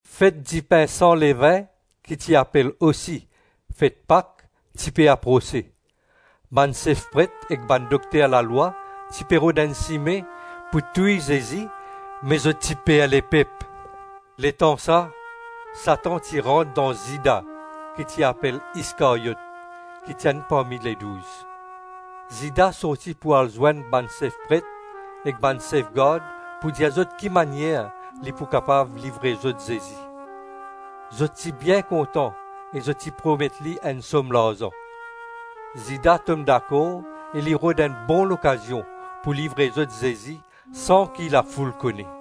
Fet dipin san levin, ki ti apel osi fet Pak, ti pe aprose. Bann sef pret ek bann dokter lalwa ti pe rod enn sime pou touy Zezi me zot ti per lepep. Letansa, Satan ti rant dan Zida ki ti apel Iskaryot, ki ti enn parmi Ledouz. Zida sorti pou al zwenn bann sef pret ek bann sef gard pou dir zot ki manier li pou kapav livre zot Zezi. Zot ti bien kontan e zot ti promet li enn som larzan. Zida tom dakor e li rod enn bon lokazion pou livre zot Zezi san ki lafoul kone.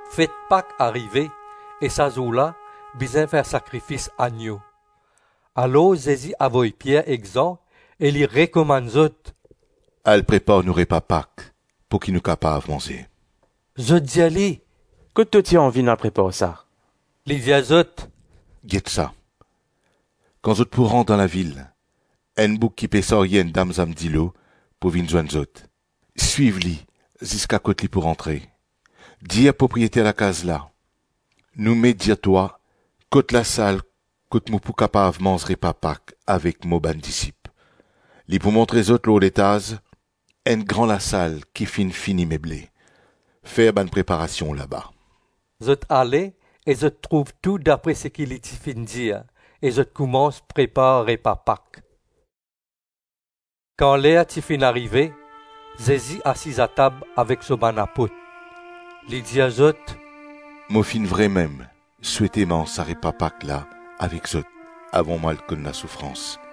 Fet Pak arive e sa zour la bizin fer sakrifis annyo. Alor Zezi avoy Pier ek Zan e li rekomann zot, “Al prepar nou repa Pak pouki nou kapav manze.” Zot dir li, “Kot to ti anvi nou al prepar sa?” Li dir zot, “Get sa, kan zot pou rant dan lavil, enn boug ki pe sarye enn damzann dilo pou vinn zwenn zot. Swiv li ziska kot li pou rantre. Dir propriyeter lakaz la, ‘Nou Met dir twa, kot lasal kot mo pou kapav manz repa Pak avek mo bann disip?’ Li pou montre zot lor letaz enn gran lasal ki finn fini meble. Fer bann preparasion laba.” Zot ale e zot trouv tou dapre seki li ti finn dir e zot koumans prepar repa Pak. Kan ler ti finn arive, Zezi asiz atab avek so bann apot. Li dir zot, “Mo finn vremem souete manz sa repa Pak la avek zot avan mo al konn lasoufrans.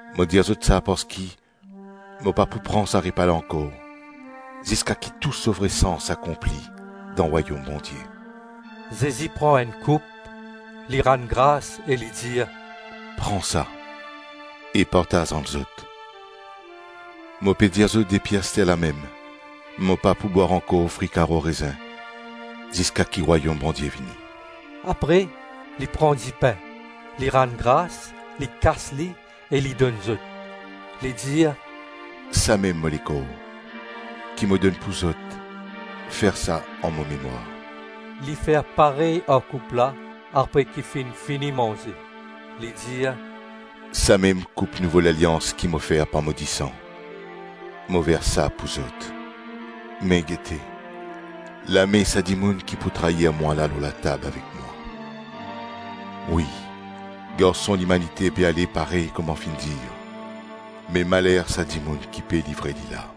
Mo dir zot sa parski mo pa pou pran sa repa la ankor ziska ki tou so vre sans akonpli dan Rwayom Bondie.” Zezi pran enn koup, li rann gras e li dir, “Pran sa e partaz ant zot. Mo pe dir zot depi asterlamem, mo pa pou bwar ankor fri karo rezin ziska ki Rwayom Bondie vini.” Apre li pran dipin, li rann gras, li kas li e li donn zot. Li dir, “Samem mo lekor, ki mo donn pou zot. Fer sa, an mo memwar.” Li fer parey ar koup la apre ki finn fini manze, li dir, “Samem koup nouvo lalians ki mo fer par mo disan. Mo vers sa pou zot. Me gete, lame sa dimoun ki pou trair mwa la lor latab avek mwa. Wi, Garson Limanite pe ale parey kouma finn dir, me maler sa dimoun ki pe livre li la.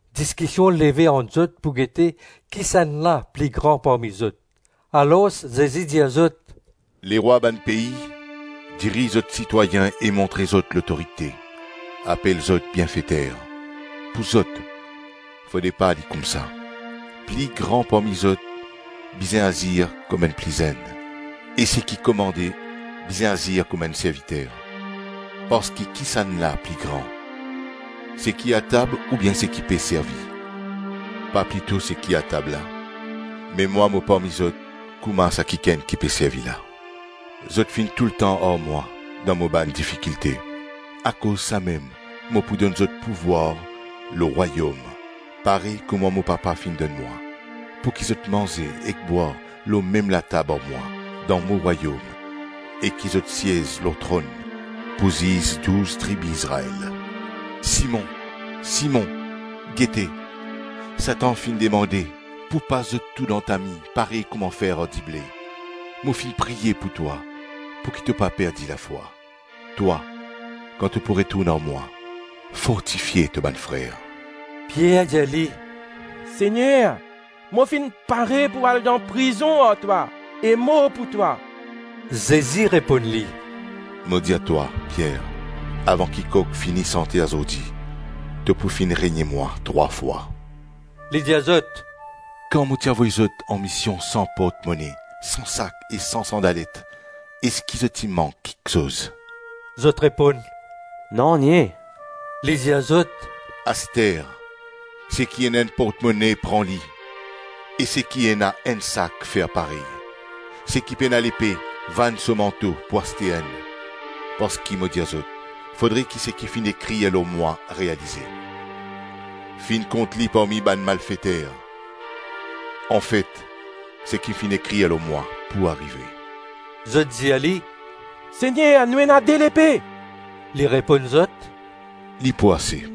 Diskision leve ant zot pou gete kisannla pli gran parmi zot. Alors Zezi dir zot, “Lerwa bann pei diriz zot sitwayin e montre zot lotorite. Apel zot ‘bienfeter’. Pou zot, fode pa li koumsa. Pli gran parmi zot bizin azir kouma enn pli zenn, e seki komande bizin azir kouma enn serviter. Parski kisannla pli gran? Seki atab oubien seki pe servi? Pa plito seki atab la? Me mwa mo parmi zot kouma sa kikenn ki pe servi la. Zot finn toultan ar mwa dan mo bann difikilte, akoz samem mo pou donn zot pouvwar lor Rwayom parey kouma mo Papa finn donn mwa, pouki zot manze ek bwar lor mem latab ar mwa dan mo Rwayom e ki zot siez lor tronn pou ziz douz tribi Izrael.” Simon, Simon, gete, Satan finn demande pou pas zot tou dan tami parey kouma fer ar dible. Mo finn priye pou twa pouki to pa perdi lafwa. Twa, kan to pou retourn ar mwa, fortifie to bann frer. Pier dir li, “Segner, mo finn pare pou al dan prizon ar twa e mor pou twa.” Zezi reponn li, “Mo dir twa, Pier, avan ki kok fini sante azordi, to pou finn renie mwa trwa fwa.” Li dir zot, “Kan mo ti avoy zot anmision san portmone, san sak e san sandalet, eski zot ti mank kiksoz?” Zot reponn, “Nanye”. Li dir zot, “Aster, seki ena enn portmone pran li e seki ena enn sak, fer parey; seki pena lepe, vann so manto pou aste enn. Parski mo dir zot, fodre ki seki finn ekrir lor mwa realize: ‘Finn kont li parmi bann malfeter’. Anfet seki finn ekrir lor mwa pou arive.” Zot dir li, “Segner, nou ena de lepe.” Li reponn zot, “Li pou ase.”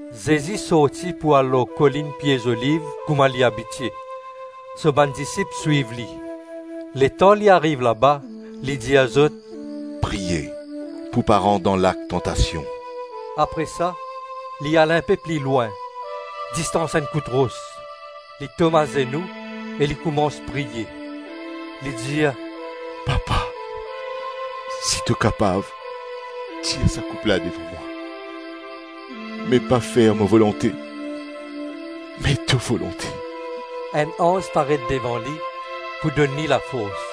Zezi sorti pou al lor kolinn Pie Zoliv kouma li abitie. So bann disip swiv li. Letan li ariv laba, li dir zot, “Priye pou pa rant dan lak tantasion.” Apre sa, li al inpe pli lwin, distans enn kout ros, li tom azenou e li koumans priye. Li dir, “Papa, si to kapav, tir sa koup la devan mwa; me pa fer mo volonte, me to volonte.” Enn anz paret devan li pou donn li lafors.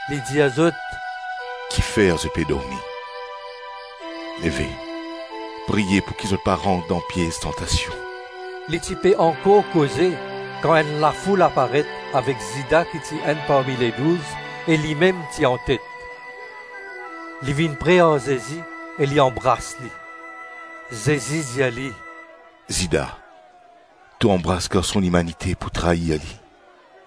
Li dir zot, “Kifer zot pe dormi? Leve, priye pouki zot pa rant dan piez tantasion.” Li ti pe ankor koze, kan enn lafoul aparet avek Zida ki ti enn parmi Ledouz e limem ti antet. Li vinn pre ar Zezi e li anbras li. Zezi dir li, “Zida, to anbras Garson Limanite pou trair li?”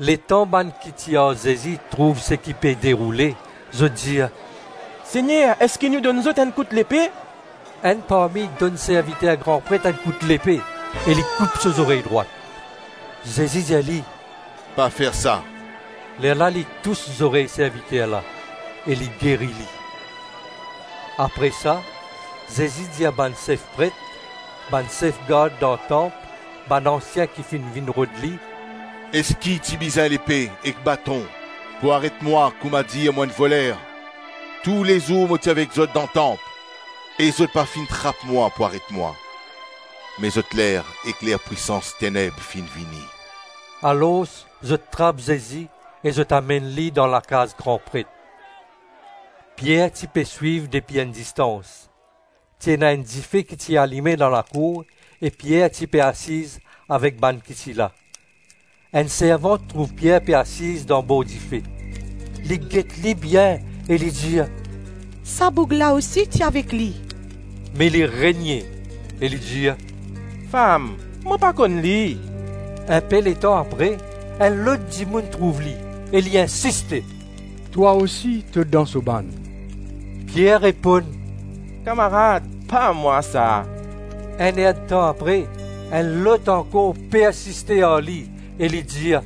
Letan bann ki ti ar Zezi trouv seki pe deroule, zot dir, “Segner, eski nou donn zot enn kout lepe?” Enn parmi donn serviter gran pret enn kout lepe e li koup so zorey drwat. Zezi dir li, “Pa fer sa.” Lerla li tous zorey serviter la, e li geri li. Apre sa, Zezi dir bann sef pret, bann sef gard dan tanp, bann ansien ki finn vinn rod li, “Eski ti bizin lepe ek baton pou aret mwa koumadir mo enn voler? Toulezour mo ti avek zot dan tanp e zot pa finn trap mwa pou aret mwa. Me zot ler ek ler pwisans teneb finn vini.” Alors zot trap Zezi e zot amenn li dan lakaz gran pret. Pier ti pe swiv depi enn distans. Ti ena enn dife ki ti alime dan lakour e Pier ti pe asiz avek bann ki ti la. Enn servant trouv Pier pe asiz dan bor dife; li get li bien e li dir, “Sa boug la osi ti avek li!” Me li renie e li dir, “Fam, mo pa konn li.” Inpe letan apre, enn lot dimoun trouv li e li insiste, “Twa osi, to dan so bann.” Pier reponn, “Kamarad, pa mwa sa.” Enn-ertan apre, enn lot ankor persiste ar li e li dir,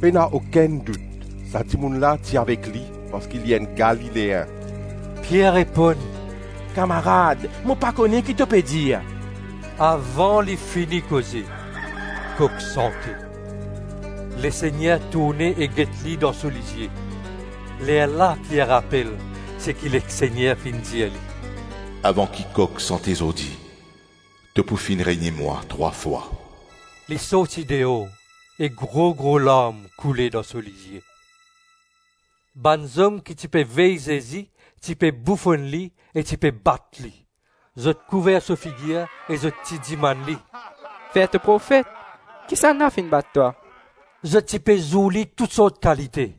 “Pena okenn dout, sa dimoun la ti avek li parski li enn Galileen.” Pier reponn, “Kamarad, mo pa kone ki to pe dir. Avan li fini koze, kok sante. Lesegner tourne e get li dan so lizie. Lerla Pier rapel seki Lesegner finn dir li, “Avan ki kok sante zordi, to pou finn renie mwa trwa fwa.” Li sorti deor e gro-gro larm koule dan so lizie. Bann zom ki ti pe vey Zezi, ti pe boufonn li e ti pe bat li. Zot kouver so figir e zot ti dimann li, “Fer to profet, kisannla finn bat twa?” Zot ti pe zour li tousort kalite.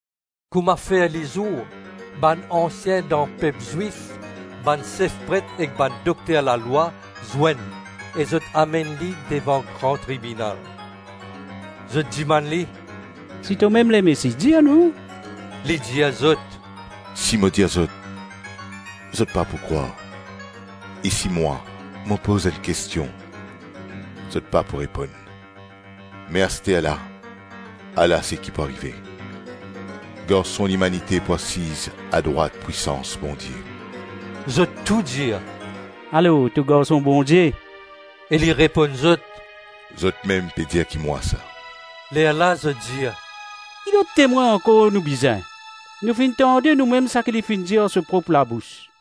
Kouma fer lizour, bann ansien dan pep Zwif, bann sef pret ek bann dokter lalwa zwenn e zot amenn li devan Gran Tribinal. Zot dimann li, “Si tomem Lemesi, dir nou.” Li dir zot, “Si mo dir zot, zot pa pou krwar. E si mwa, mo poz enn kestion, zot pa pou reponn. Me asterla, ala seki pou arive - Garson Limanite pou asiz adrwat pwisans Bondie.” Zot tou dir, “Alors to Garson Bondie?” E li reponn zot, “Zotmem pe dir ki mwa sa.” Lerla zot dir, “Ki lot temwin ankor nou bizin? Nou finn tande noumem saki li finn dir ar so prop labous.”